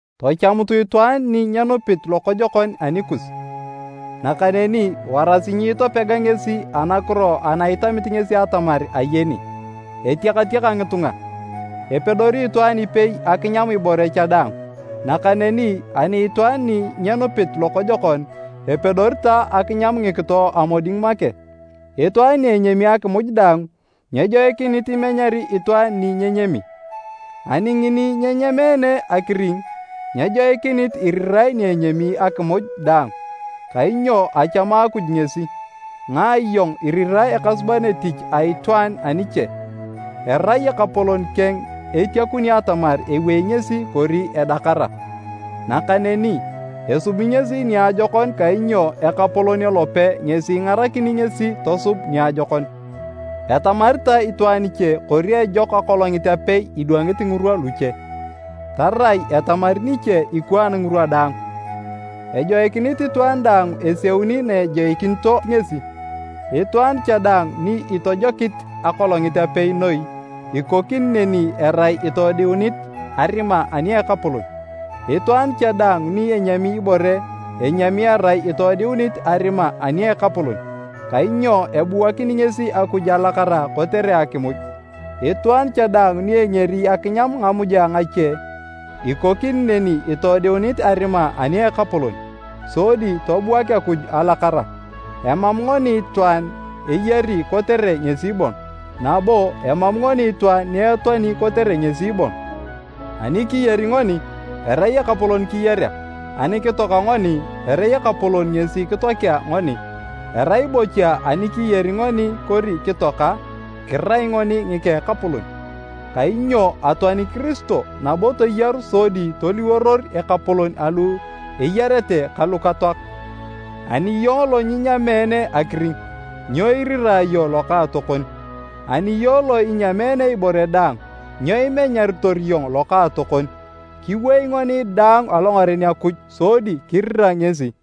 Tachamutu itwaan ni nyenupit lokojokon anikus, nakaneni warasi nyiitopega ngesi anakiro ana itamit ngesi atamar ayeni. Etiakatiaka ngitunga, epedori itwaan ipei akinyam ibore cha daang. Nakaneni ani itwaan ni nyenupit lokojokon, epedori ta akinyam ngikito a moding make. Itwaan ni enyami akimuj daang, nyejoikinit imenyari itwaan ni nyenyami. Ani ngini nyenyameene akiring, nyejoikinit irirae ni enyami akimuj daang, kainyo achamu Akuj ngesi. Ngae iyong irirae ekasuban etich a itwaan aniche? Erai Ekapolon keng etiakuni atamar ewei ngesi kori edakara. Nakaneni, esubi ngesi niajokon kainyo Ekapolon elope ngesi ingarakini ngesi tosub niajokon. Etamari ta itwaan iche kori ejok akolongit apei idwangit ngirwa luche, tarai etamari niche ikwaan ngirwa daang. Ejoikinit itwaan daang eseuni na ejoikinito ngesi. Itwaan cha daang ni itojokit akolongit apei noi, ikokini neni erai itoodiunit arima ani a Ekapolon. Itwaan cha daang ni enyami ibore enyami erai itoodiunit arima ani a Ekapolon, kainyo ebuakini ngesi Akuj alakara kotere akimuj. Itwaan cha daang ni engeri akinyam ngamuja ngache, ikokini neni itoodiunit arima ani a Ekapolon, sodi tobuak Akuj alakara. Emam ngoni itwaan eyari kotere ngesi bon, nabo emam ngoni itwaan ni etoani kotere ngesi bon. Ani kiyari ngoni, erai Ekapolon kiyarea. Ani kitoaka ngoni erai Ekapolon ngesi kitoakea ngoni. Erai bocha ani kiyari ngoni kori kitoaka, kirai ngoni ngika Ekapolon. Kainyo atoani Kiristo nabo toyaru sodi toliworor Ekapolon alu eyarete ka lukatoak. Ani iyong lo nyinyameene akiring, nyo irira iyong lokaatokon? Ani iyong lo inyameene ibore daang, nyo imenyaritor iyong lokaatokon? Kiwei ngoni daang alongaren Akuj sodi kirira ngesi.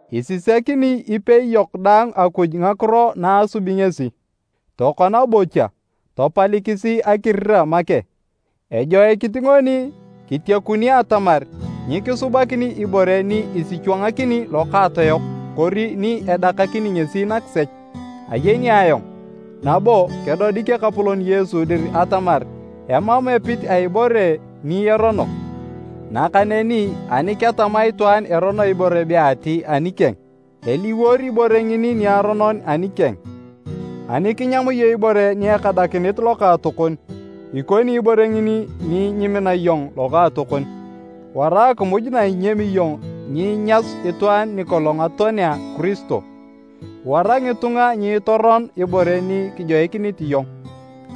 Isisakini ipei yok daang Akuj ngakiro na asubi ngesi. Tokona bocha, tapalikisi akirira make. Ejoikinit ngoni kitiekuni atamar nyikisubakini ibore ni isichwangakini lokaatoyok kori ni edakakini ngesi nakisech. Ayeni ayong, nabo kedodik Ekapolon Yesu dir atamar emam epit a ibore ni erono, nakaneni ani ketama itwaan erono ibore be ati anikeng, eliwor ibore ngini niaronon anikeng. Ani kinyam iyong ibore ni ekadakinit lokaatokon, ikoni ibore ngini ni nyimina iyong lokaatokon. Wara akimuj na inyami iyong nyinyasu itwaan nikolong atoanea Kiristo! Wara ngitunga nyiitoron ibore ni kijoikinit iyong.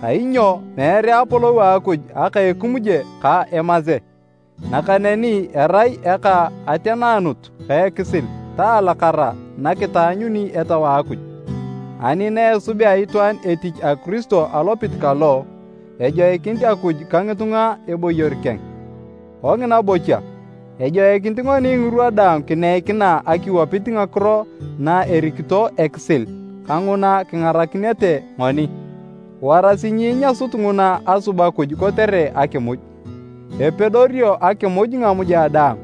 Kainyo meere apolou a Akuj aka ekimuje ka emase, nakaneni erai eka ateneanut ka ekisil ta alakara nakitaanyuni Etau a Akuj. Ani na esubea itwaan etich a Kiristo alopit kalo, ejoikini Akuj ka ngitunga eboyor keng. Kongina bocha, ejoikinit ngoni ngirwa daang kineikina akiwapit ngakiro na erikito ekisil kanguna kingarakinete ngoni. Warasi nyiinyasut nguna asub Akuj kotere akimuj. Epedorio akimuj ngamuja daang,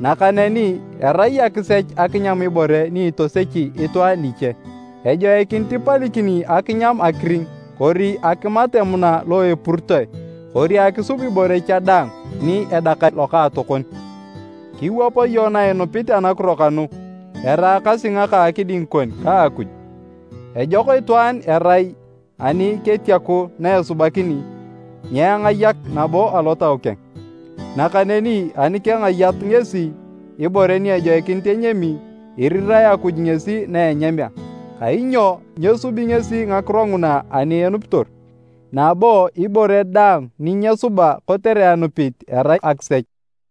nakaneni erai akisech akinyam ibore ni itosechi itwaan niche. Ejoikinit ipalikini akinyam akiring kori akimat emuna lo epuritoe kori akisub ibore cha daang ni edakari lokaatokon. Kiwap iyong na inupit anakiro kanu, eraakasi ngaka akiding kon ka Akuj. Ejok itwaan erai ani ketiaku na esubakini, nyengayak nabo alotau keng! Nakaneni ani kengayat ngesi ibore ni ejoikinit enyami, irirae Akuj ngesi na enyamea, kainyo nyesubi ngesi ngakiro nguna ani enupitor. Nabo ibore daang ni nyesuba kotere anupit, erai akisech.